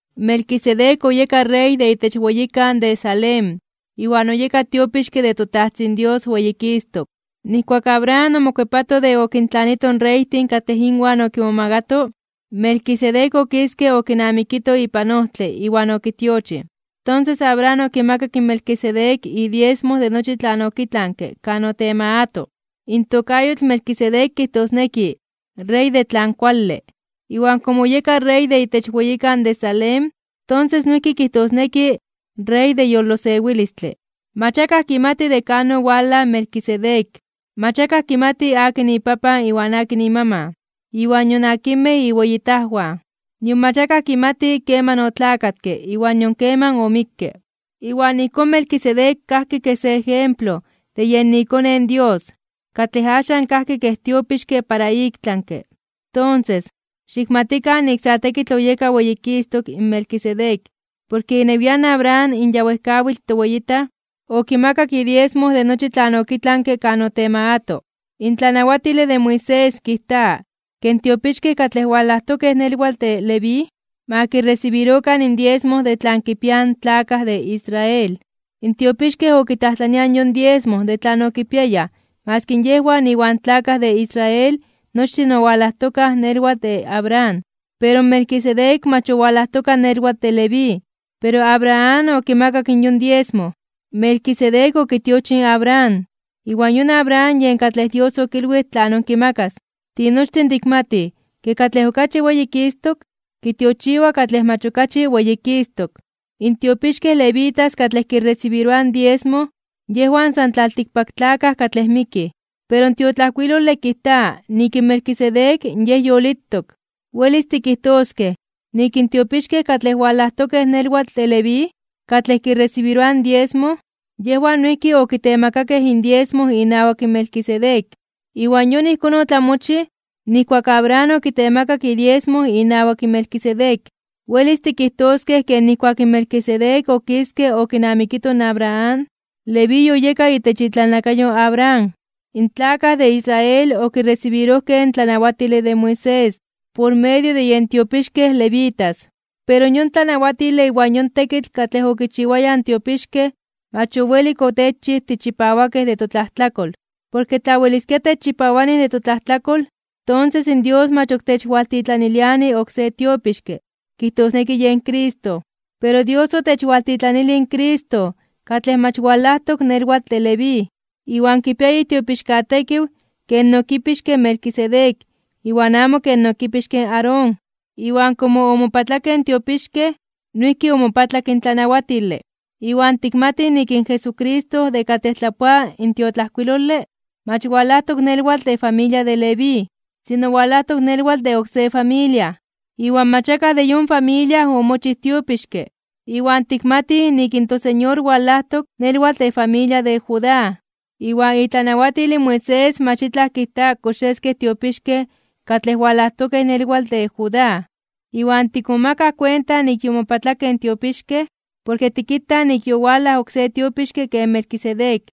Melquisedec oyeka rey de itech weyikan de Salem, iwan oyeka tiopixke de toTajtzin Dios weyikistok. Nijkuak Abraham omokuepato de okintlanito in reytin katlej inwan okinmomagato, Melquisedec okiske okinamikito ipan ojtle iwan okitiochij. Tonses Abraham okimakak in Melquisedec idiesmo de nochi tlan okitlanke kan otemagato. In tokayotl Melquisedec kijtosneki “rey de tlan kuale”. Iwan komo oyeka rey de itech weyikan de Salem, tonses noijki kijtosneki “rey de yolosewilistle”. Mach akaj kimati de kan owalaj in Melquisedec. Mach akaj kimati akin ipapan iwan akin imaman, iwan nion akinmej iweyitajwan. Nion mach akaj kimati keman otlakatke iwan nion keman omikke. Iwan ijkón Melquisedec kajki kej se ejemplo de yen iKone in Dios, katlej axan kajki kej tiopixke para iktlanke (ik tlami). Tonses, xikmatikan nik sa tekitl oyeka weyikistok (weyititok) in Melquisedec, porke inewian Abraham in ya wejkawitl toweyitaj, okimakak idiesmo de nochi tlan okitlanke kan otemagato (otemakato). In tlanawatile de Moisés kijta ke in tiopixkej katlej walajtokej nelwatl de Leví, ma kiresibirokan indiesmo de tlan kipiaj in tlakaj de Israel. In tiopixkej okitlajtlaniaj yon diesmo de tlan okipiayaj maski yejwan iwan tlakaj de Israel nochtin owalajtokaj nelwatl de Abraham. Pero Melquisedec mach owalajtoka nelwatl de Leví, pero Abraham okimakak yon diesmo. Melquisedec okitiochij in Abraham, iwan yon Abraham yen katlej Dios okilwij tlanon kimakas. Tinochtin tikmatij ke katlej okachi weyikistok kitiochiwa katlej mach okachi weyikistok (weyititok). In tiopixkej levitas katlej kiresibiroaj diesmo, yejwan san tlaltikpaktlakaj katlej mikij. Pero in tiotlajkuilole kijta nik in Melquisedec yej yolitok. Welis tikijtoskej nik in tiopixkej katlej walajtokej nelwatl de Leví, katlej kiresibiroaj diesmo, yejwan noijki okitemakakej indiesmo inawak Melquisedec. Iwan yon ijkón otlamochij nijkuak Abraham okitemakak idiesmo inawak Melquisedec. Welis tikijtoskej ke nijkuak Melquisedec okiske okinamikito in Abraham, Leví yoyeka itech itlalnakayo in Abraham. In tlakaj de Israel okiresibirojkej in tlanawatile de Moisés por medio de yen tiopixkej levitas. Pero yon tlanawatile iwan yon tekitl katlej okichiwayaj in tiopixkej mach owelik otechchij tichipawakej de totlajtlakol. Porke tla weliskia techchipawani de totlajtlakol, tonses in Dios mach ok techwaltitlaniliani oksé tiopixke kijtosneki yen Cristo. Pero Dios otechwaltitlanilij in Cristo katlej mach walajtok nelwatl de Leví, iwan kipia itiopixkatekiw ken okipixke Melquisedec iwan amo ken okipixke in Aarón. Iwan komo omopatlakej in tiopixkej, noijki omopatlak in tlanawatile. Iwan tikmatij nik in Jesucristo de katlej tlapoa in tiotlajkuilole, mach walajtok nelwatl de familia de Leví, sino walajtok nelwatl de oksé familia. Iwan mach akaj de yon familia omochij tiopixke. Iwan tikmatij nik in toSeñor walajtok nelwatl de familia de Judá, iwan itlanawatil in Moisés mach itlaj kijta kox yeskej tiopixkej katlej walajtokej nelwatl de Judá. Iwan tikmomakaj kuenta nik yomopatlakej in tiopixkej, porke tikitaj nik yowalaj oksé tiopixke ken Melquisedec.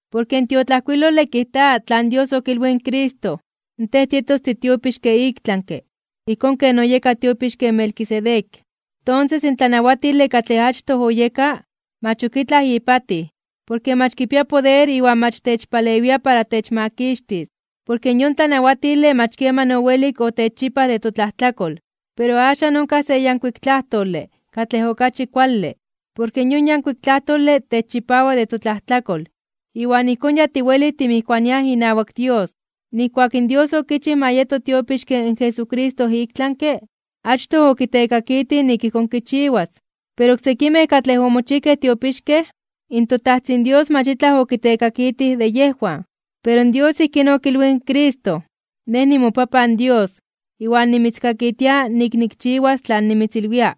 Porke in tiotlajkuilole kijta tlan Dios okilwij in Cristo: Tej tietos titiopixke iktlanke, ijkón ken oyeka tiopixke in Melquisedec. Tonses, in tlanawatile katlej achtoj oyeka, mach ok itlaj ipatij. Porke mach kipia poder iwan mach techpalewia para techmakixtis. Porke yon tlanawatile mach keman owelik otechchipaj de totlajtlakol. Pero axan onkaj se yankuik tlajtole katlej okachi kuale porke yon yankuik tlajtole techchipawa de totlajtlakol, iwan ijkón ya tiwelij timijkuaniaj inawak Dios. Nijkuak in Dios okichij ma yeto tiopixke in Jesucristo iktlanke (ik tlami), achtoj okitekakitij nik ijkón kichiwas. Pero oksekimej katlej omochijkej tiopixkej, in toTajtzin Dios mach itlaj okitekakitij de yejwan. Pero Dios ijkín okilwij in Cristo: Nej nimoPapan Dios iwan nimitzkakitia nik nikchiwas tlan nimitzilwia,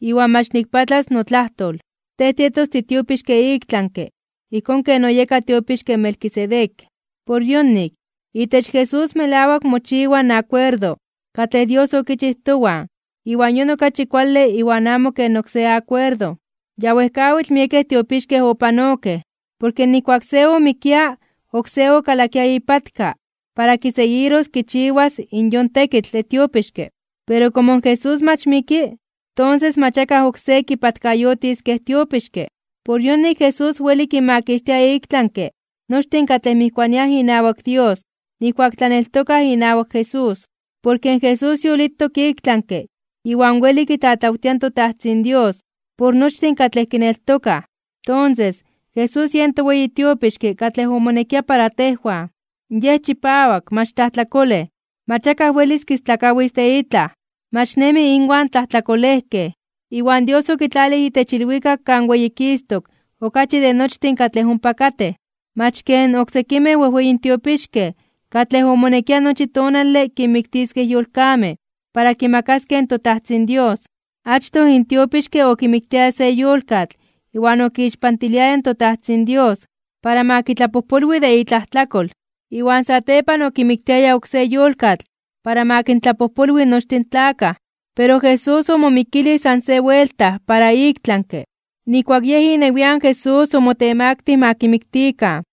iwan mach nikpatlas notlajtol: “Tej tietos titiopixke iktlanke (ik tlami), ijkón ken oyeka tiopixke in Melquisedec.” Por yonik, itech Jesús melawak mochiwa in akuerdo katlej Dios okichij towan iwan yon okachi kuale iwan amo ken oksé akuerdo. Ya wejkawitl miekej tiopixkej opanokej, porke nijkuak se omikia oksé okalakia ipatka para kiseguiros kichiwas yon tekitl de tiopixke. Pero komo in Jesús mach miki, tonses mach akaj oksé kipatkayotis kej tiopixke. Por yonik Jesús weli kinmakixtia iktlanke (ik tlami) nochtin katlej mijkuaniaj inawak Dios nijkuak tlaneltokaj inawak Jesús. Porke Jesús yolitok iktlanke iwan weli kitlatlawtia in toTajtzin Dios por nochtin katlej kineltokaj. Tonses, Jesús yen toweyi tiopixke katlej omonekia para tejwan. Yej chipawak, mach tlajtlakolej, mach akaj welis kistlakawis de itlaj, mach nemi inwan tlajtlakolejkej, iwan Dios okitlalij itech ilwikak kan weyikistok (weyititok) okachi de nochtin katlej ompa katej. Mach ken oksekimej wejweyin tiopixkej katlej omonekia nochi tonale kinmiktiskej yolkamej para kimakaskej in toTajtzin Dios. Achtoj in tiopixke okimiktiaya se yolkatl iwan okixpantiliaya in toTajtzin Dios para ma kitlapojpolwi de itlajtlakol, iwan satepan okimiktiaya oksé yolkatl para ma kintlapojpolwi nochtin in tlakaj. Pero Jesús omomikilij san se buelta para iktlanke (ik tlami), nijkuak Yej inewian Jesús omotemaktij (omotemaktilij) ma kimiktikan.